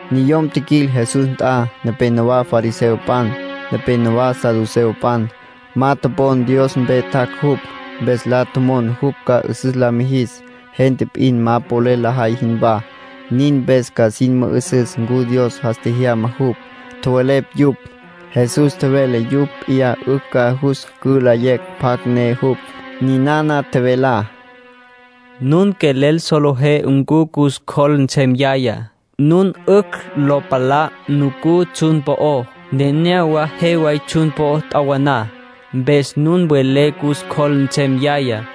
Niyom tjiquil Jesús nt'a, nepénowa fariseopan, nepénowa saduceopan. Ma topon Dios mpe tjac' jupj, mpes la tjomon jupj ca 'üsüs la mijis, gente p'in ma polel lajay jinwá. Nin mpes ca sin mü'üsüs ncu Dios jas tjejyama jupj, tjowelepj yupj. Jesús tjevele yupj p'iyá 'ücj ca jus cülayecj pjacj ne jupj. Ninana tjevelá: “Nun quelel solejé ncu cus cjol nsem yayá, nun 'ücj lo palá nucú tsjun po'ó. Nenéyawa je way tsjun po'ó t'awaná. Mpes nun welé cus cjol nsem yayá.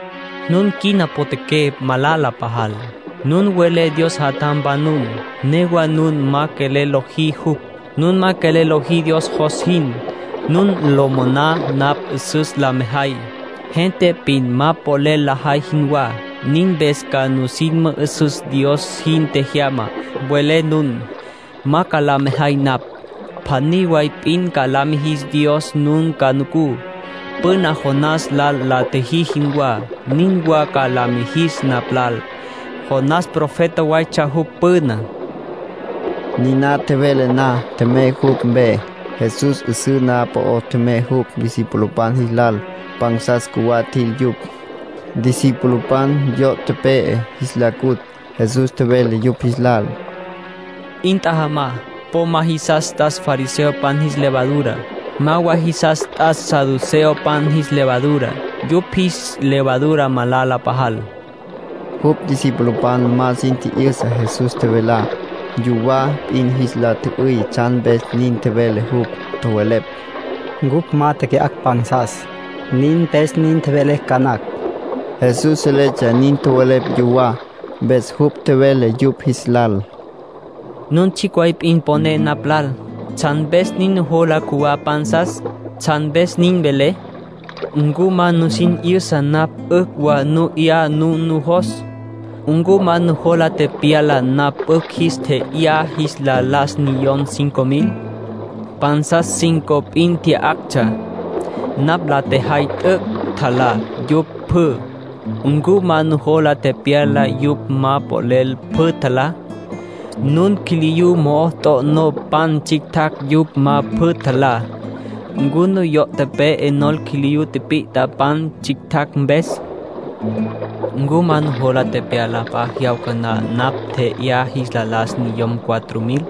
Nun quina potjaqué malala pajal. Nun welé Dios jatjampan nun, newa nun ma quelel lojí jupj. Nun ma quelel lojí Dios jos jin. Nun lo moná napj 'üsüs la mejay, gente p'in ma polel lajay jinwá. Nin mpes ca nusin mü'üsüs Dios nin tjejyama, welé nun. Ma ca la mejay napj. Pjaní way p'in ca la mijis Dios nun ca nucú. Püna Jonás lal la tjiji jinwá, nin wa ca la mijis napj lal. (Jonás profeta waytsja jupj püná)”, nin tjevele Jesús. Niná tjevele na, tjemey yupj mpe. Jesús 'üsǘ na'aj po'ó tjemey jupj discipulopan jis lal. Pansas cjuwá tjil yupj, discipulopan. Yo' tepe'e jis la cutj. Jesús tjevele yupj jis lal: —'In tjajama. Po ma jisas t'as fariseopan jis levadura. Ma wa jisas t'as saduceopan jis levadura. Yupj jis levadura malala pajal. Jupj discipulopan ma sin tji'yüsa Jesús tjevelá. Yuwá p'in jis la tjü'üy tsjan mpes nin tjevele jupj. Tjowelepj: “Cupj ma teque'acj pansas. Nin mpes nin tjevele ca nacj.” Jesús seletsja nin tjowelepj yuwá. Mpes jupj tjevele yupj jis lal: —Nun tsjicj way p'in poné napj lal. ¿Tsjan mpes nin nujola cjuwá pansas? ¿Tsjan mpes nin welé? ¿Ncu ma nusin 'yüsa napj 'ücj wa nu 'ya nun nujos? ¿Ncu ma nujola tepyala napj 'ücj jis tje'yá jis la las niyom cinco mil? Pansas cinco p'in tya'actsja; napj la tjejay t'üc' tjalá yupj pjü. ¿Ncu ma nujola tepyala yupj ma polel pjü tjalá? Nun quiliyú mo'o t'o'nó pan tsjictjacj yupj ma pjü tjalá. ¿Ncu nuyo' tepe'e nol quiliyú tipit'a pan tsjictjacj mpes? ¿Ncu ma nujola tepyala p'a jyawca na napj tje'yá jis la las niyom cuatro mil?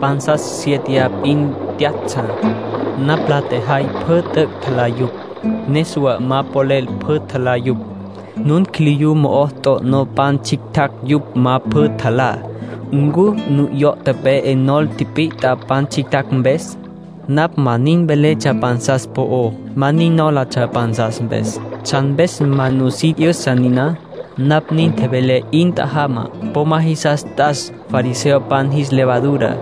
Pansas siete p'in tya'actsja; napj la tjejay t'üc' tjalá yupj pjü. Niswa ma polel pjü tjalá yupj. Nun quiliyú mo'o t'o'nó pan tsjictjacj yupj ma pjü tjalá. ¿Ncu nuyo' tepe'e nol quiliyú tipit'a pan tsjictjacj mpes? Napj ma nin veletsja pansas po'ó. Ma nin nólatsja pansas mpes. ¿Tsjan mpes ma nusin 'yüsa niná? Napj nin tjevelé 'in tjajama. Po ma jisas t'as fariseopan jis levadura.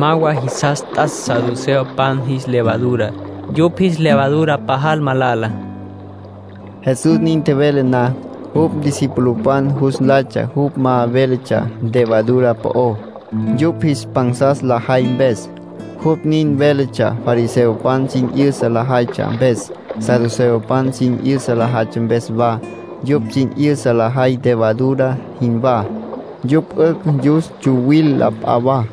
Ma wa jisas t'as saduceopan jis levadura. Yupj jis levadura malala pajal —nin tjevele Jesús. Jesús nin tjevele na, jupj discipulopan jus nlaytsja jupj ma véletsja levadura po'ó, yupj jis pansas lajay mpes. Jupj nin véletsja fariseopan sin 'yüsa lajaytsja mpes, saduceopan sin 'yüsa lajaytsja mpes wa. Yupj sin 'yüsa lajay levadura jinwá. Yupj 'ücj yus tsuwil la p'a wa.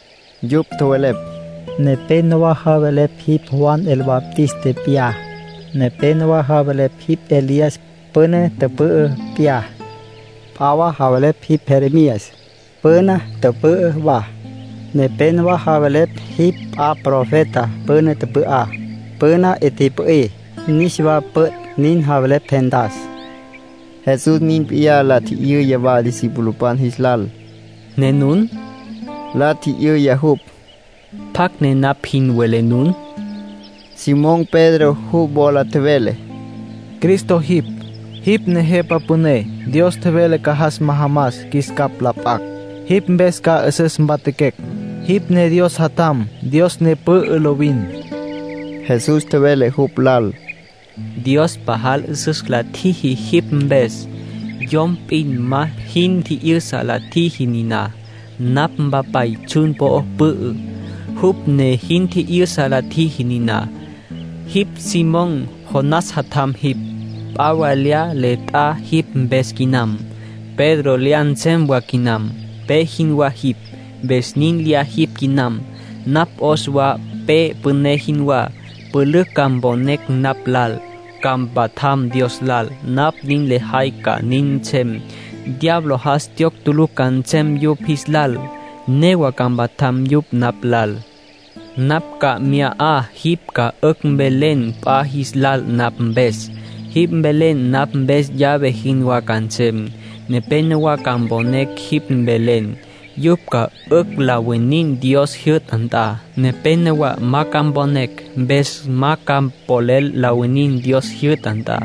Yupj tjowelepj: —Nepénowa javelepj jipj Juan el Bautista p'iyá. Nepénowa javelepj jipj Elías, püna tüpü'ü p'iyá. P'a wa javelepj jipj Jeremías, püna tüpü'ü wa. Nepénowa javelepj jipj p'a profeta püna tüpü'á. Püna 'i tipü'í, niswa püt', nin javelepj gentas. Jesús nin p'iyá la tji'yüya wa discipulopan jis lal. —¿Ne nun? —la tji'yüya jupj—. ¿Pjacj ne napj jin welé nun? Simón Pedro jupj wola tjevele: —Cristo jipj. Jipj ne Jepa Püné Dios tjevele ca jas majamas qjuis capj la p'acj. Jipj mpes ca 'üsüs mpatjaquecj. Jipj ne Dios Jatjam, Dios ne pü'ü lovin —tjevele jupj. Jesús tjevele jupj lal: —Dios pajal 'üsüs la tjiji jipj mpes. Yom p'in ma jin tji'yüsa la tjiji niná. Napj Mpapay tsjun po'o pü'ü, jupj ne jin tji'yüsa la tjiji niná. Jipj Simón, Jonás jatjam jipj. P'a wa lyá le t'a jipj mpes quinam. Pedro lyá nsem wa quinam. Pe jinwá jipj, mpes nin lyá jipj quinam. Napj 'os wa pe püné jinwá. Pülücj ca mponecj napj lal, ca mpatjam Dios lal. Napj nin lejay ca nin nsem. Diablo jas tjiyocj tulucj ca nsem yupj jis lal. Newa ca mpatjam yupj napj lal. Napj ca mya 'a jipj ca 'ücj mvelen p'a jis lal napj mpes. Jipj velen napj mpes llave jinwá ca nsem. Nepénowa ca mponecj jipj velen. Yupj ca 'ücj la winin Dios jyü'ta nt'a. Nepénowa ma ca mponecj. Mpes ma ca polel la winin Dios jyü'ta nt'a.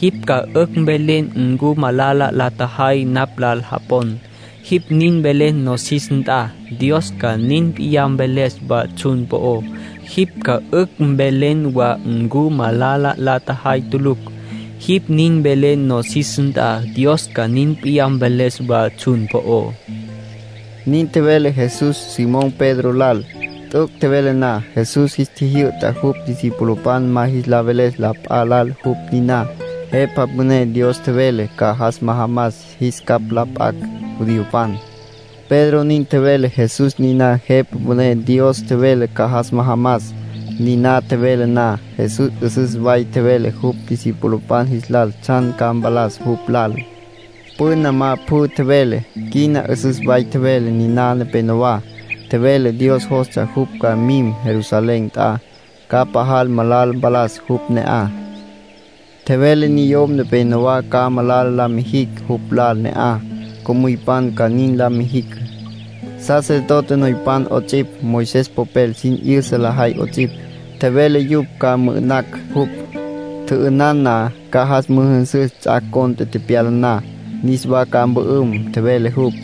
Jipj ca 'ücj mvelen ncu malala la tjajay napj lal japon. Jipj nin velen nosis nt'a, Dios ca nin p'iyá mveles wa tsjun po'ó. Jipj ca 'ücj mvelen wa ncu malala la tjajay tulucj. Jipj nin velen nosis nt'a, Dios ca nin p'iyá mveles wa tsjun po'ó —nin tjevele Jesús Simón Pedro lal. T'üc' tjevele na, Jesús jis tjijyü'ta jupj discipulopan ma jis la veles la p'a lal jupj niná Jepa Püné Dios tjevele ca jas majamas jis capj la p'acj judiopan. Pedro nin tjevele Jesús niná Jepa Püné Dios tjevele ca jas majamas. Niná tjevele na, Jesús 'üsüs way tjevele jupj discipulopan jis lal tsjan ca mpalas jupj lal. Püna ma pjü tjevele. Quina 'üsüs way tjevele niná neneyawá. Tjevele Dios jostsja jupj ca mim Jerusalén nt'a, ca pajal malala mpalas jupj ne'aj. Tjevele niyom nepénowa ca malala la mijicj jupj lal ne'aj. Co'müypan ca nin la mijicj, sacerdote noypan 'ots'ipj, Moisés popel sin 'yüsa lajay 'ots'ipj. Tjevele yupj ca mü'ü'nacj jupj. Tjü'ünan na, ca jas müjünsüs ts'ac' cont'e tepyala na. Niswa ca mpü'üm, tjevele jupj.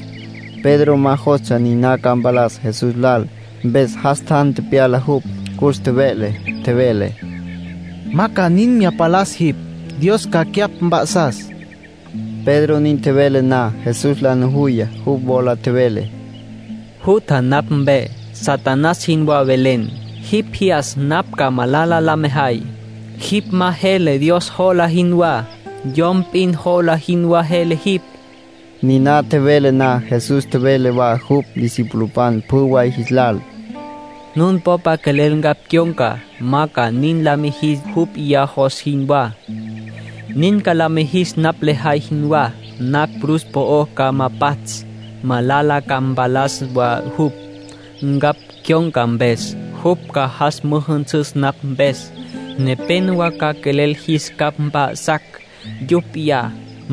Pedro ma jostsja niná ca mpalas Jesús lal, mpes jas tjan tjemyana jupj, cus tjeve'le. Tjevele: —Ma ca nin mya palas jipj. Dios ca cyapj mp'a'sas. Pedro nin tjevele na, Jesús la nujuya, jupj wola tjevele: —Jutja napj mpe. Satanás jinwá velen. Jipj jyas napj ca malala la mejay. Jipj ma jele Dios jola jinwá. Yom p'in jola jinwá jele jipj. Niná tjevele na, Jesús tjevele wa jupj discipulopan pjü way jis lal: —Nun popa quelel ncapj cyon̈ca, ma ca nin la mijis jupj p'iyá jos jinwá. Nin ca la mijis napj lejay jinwá. Napj cruz po'ó ca ma pats'. Malala ca mpalas wa jupj, ncapj cyon̈ca mpes. Jupj ca jas mü'üsüs napj mpes. Nepénowa ca quelel jis capj mp'a'sacj yupj p'iyá.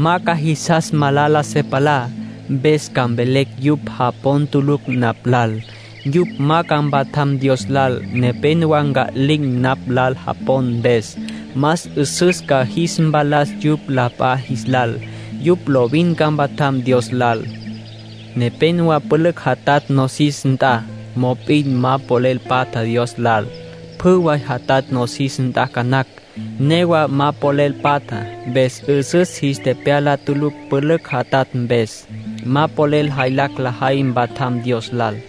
Ma ca jisas malala se palá, mpes ca mvelecj yupj japon tulucj napj lal. Yupj ma ca mpatjam Dios lal. Nepénowa nca'lin̈ napj lal japon mpes. Más 'üsüs ca jis mpalas yupj la p'a jis lal. Yupj lovin ca mpatjam Dios lal. Nepénowa pülücj jatatj nosis nt'a, mop'in ma polel patja Dios lal. Pjü way jatatj nosis nt'a ca nacj. Newa ma polel patja, mpes 'üsüs jis tepyala tulucj pülücj jatatj mpes. Ma polel jaylacj lajay mpatjam Dios lal.